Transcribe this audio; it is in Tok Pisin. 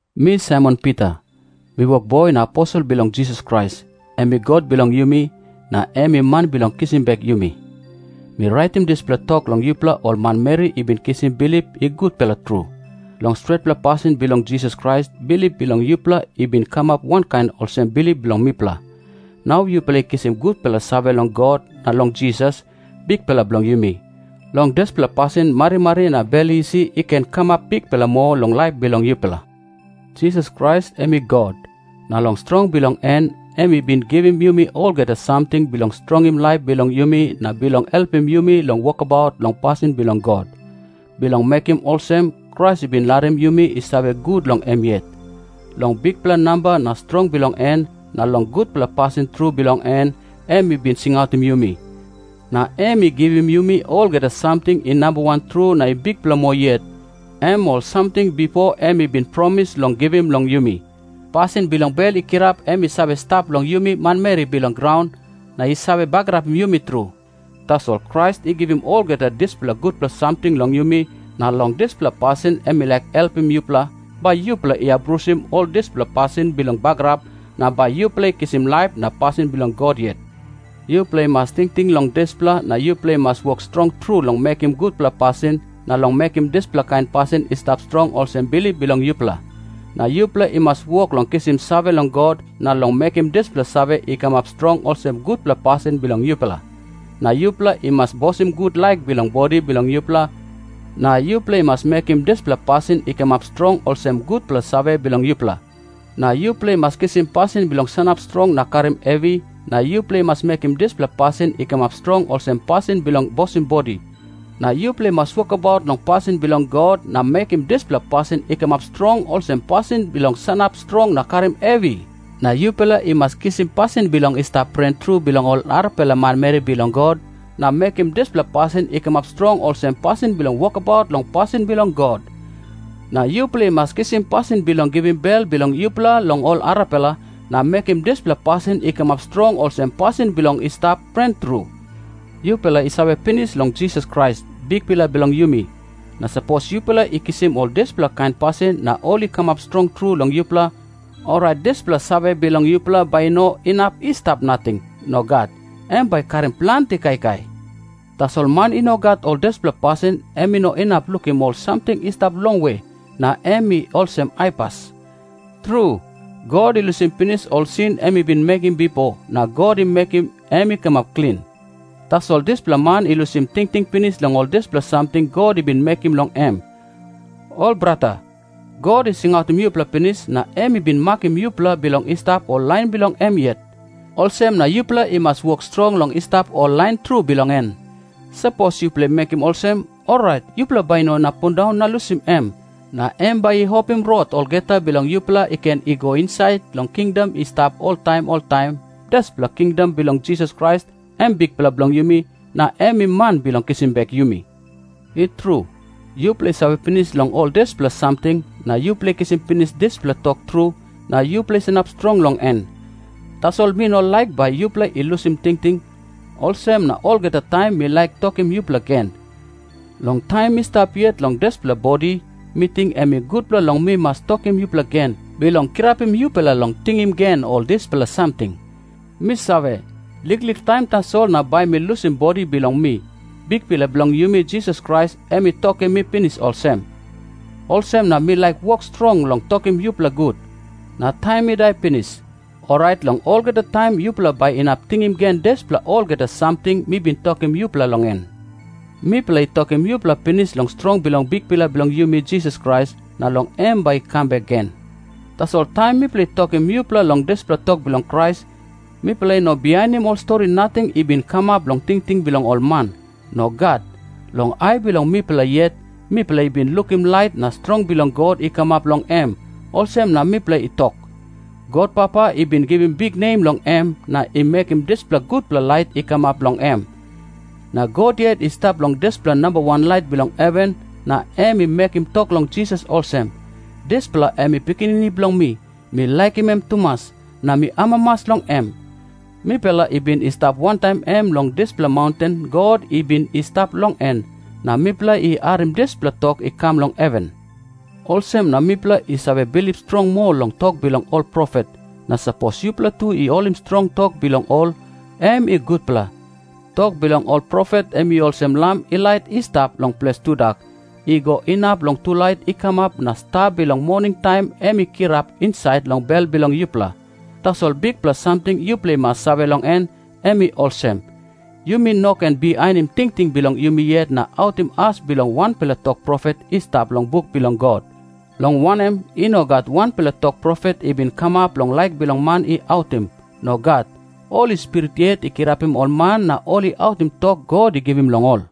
Mi Saimon Pita, mi wokboi na aposel bilong Jisas Krais, em i God bilong yumi, na em i Man bilong kisim bek yumi. Mi raitim dispela tok long yupela ol manmeri i bin kisim bilip i gutpela tru. Long stretpela pasin bilong Jisas Krais, bilip bilong yupela i bin kamap wankain olsem bilip bilong mipela. Nau yupela i kisim gutpela save long God na long Jisas, Bikpela bilong yumi. Long dispela pasin marimari na bel isi i ken kamap bikpela moa long laip bilong yupela. Jisas Krais em i God, na long strong bilong en, em i bin givim yumi olgeta samting bilong strongim laip bilong yumi na bilong helpim yumi long wokabaut long pasin bilong God. Bilong mekim olsem, Krais i bin larim yumi i save gut long em yet. Long bikpela namba na strong bilong en na long gutpela pasin tru bilong en, em i bin singautim yumi na em i givim yumi olgeta samting i nambawan tru na i bikpela moa yet, em ol samting bipo em i bin promis long givim long yumi. Pasin bilong bel i kirap em i save stap long yumi manmeri bilong graun na i save bagarapim yumi tru. Tasol Krais i givim olgeta dispela gutpela samting long yumi, na long dispela pasin em i laik helpim yupela, bai yupela i abrusim ol dispela pasin bilong bagarap, na bai yupela i kisim laip na pasin bilong God yet. Yupela i mas tingting long dispela, na yupela i mas wok strong tru long mekim gutpela pasin, na long mekim dispela kain pasin i stap strong olsem bilip bilong yupela. Na yupela i mas wok long kisim save long God, na long mekim dispela save i kamap strong olsem gutpela pasin bilong yupela. Na yupela i mas bosim gut laik bilong bodi bilong yupela, na yupela i mas mekim dispela pasin i kamap strong olsem gutpela save bilong yupela. Na yupela i mas kisim pasin bilong sanap strong na karim hevi, na yupela i mas mekim dispela pasin i kamap strong olsem pasin bilong bosim bodi. Na yupela i mas wokabaut long pasin bilong God, na mekim dispela pasin i kamap strong olsem pasin bilong sanap strong na karim hevi. Na yupela i mas kisim pasin bilong i stap pren tru bilong ol arapela manmeri bilong God, na mekim dispela pasin i kamap strong olsem pasin bilong wokabaut long pasin bilong God. Na yupela i mas kisim pasin bilong givim bel bilong yupela long ol arapela, na mekim dispela pasin i kamap strong olsem pasin bilong i stap pren tru. Yupela i save pinis long Jisas Krais, Bikpela bilong yumi. Na sapos yupela i kisim ol dispela kain pasin na ol i kamap strong tru long yupela, orait dispela save bilong yupela bai i no inap i stap nating. Nogat. Em bai i karim planti kaikai. Tasol man i no gat ol dispela pasin, em i no inap lukim ol samting i stap longwe, na em i olsem aipas. Tru, God i lusim pinis ol sin em i bin mekim bipo na God i mekim em i kamap klin. Tasol dispela man i lusim tingting pinis long ol dispela samting God i bin mekim long em. Ol brata, God i singautim yupela pinis, na em i bin makim yupela bilong i stap ol lain bilong em yet. Olsem na yupela i mas wok strong long i stap ol lain tru bilong en. Sapos yupela i mekim olsem, orait yupela bai i no inap pundaun na lusim em. Na em bai i opim rot olgeta bilong yupela i ken i go insait long kingdom i stap oltaim oltaim, dispela kingdom bilong Jisas Krais, em Bikpela bilong yumi, na em i Man bilong kisim bek yumi. I tru, yupela i save pinis long ol dispela samting, na yupela i kisim pinis dispela tok tru, na yupela i sanap strong long en. Tasol mi no laik bai yupela i lusim tingting, olsem na olgeta taim mi laik tokim yupela gen. Long taim mi stap yet long dispela bodi, mi ting em i gutpela long mi mas tokim yupela gen, bilong kirapim yupela long tingim gen ol dispela samting. Mi save, liklik taim tasol na bai mi lusim bodi bilong mi. Bikpela bilong yumi Jisas Krais em i tokim mi pinis olsem. Olsem na mi laik wok strong long tokim yupela gut. Na taim mi dai pinis, orait long olgeta taim yupela bai inap tingim gen dispela olgeta samting mi bin tokim yupela long en. Mipela i tokim yupela pinis long strong bilong Bikpela bilong yumi Jisas Krais, na long em bai i kam bek gen. Tasol taim mipela i tokim yupela long dispela tok bilong Krais, mipela i no bihainim ol stori nating i bin kamap long tingting bilong ol man. Nogat. Long ai bilong mipela yet, mipela i bin lukim lait na strong bilong God i kamap long em, olsem na mipela i tok. God Papa i bin givim biknem long em, na i mekim dispela gutpela lait i kamap long em. Na God yet i stap long dispela nambawan lait bilong heven na em i mekim tok long Jisas olsem, “Dispela em i Pikinini bilong mi, mi laikim em tumas, na mi amamas long em.” Mipela i bin i stap wantaim em long dispela maunten God i bin i stap long en, na mipela i harim dispela tok i kam long heven. Olsem na mipela i save bilip strong moa long tok bilong ol profet, na sapos yupela tu i holim strong tok bilong ol, em i gutpela. Tok bilong ol profet em i olsem lam i lait i stap long ples tudak, i go inap long tulait i kamap na sta bilong moningtaim em i kirap insait long bel bilong yupela. Tasol bikpela samting yupela i mas save long en, em i olsem. Yumi no ken bihainim tingting bilong yumi yet na autim as bilong wanpela tok profet i stap long buk bilong God. Long wanem, i no gat wanpela tok profet i bin kamap long laik bilong man i autim. Nogat. Holi Spirit yet i kirapim ol man na ol i autim tok God i givim long ol.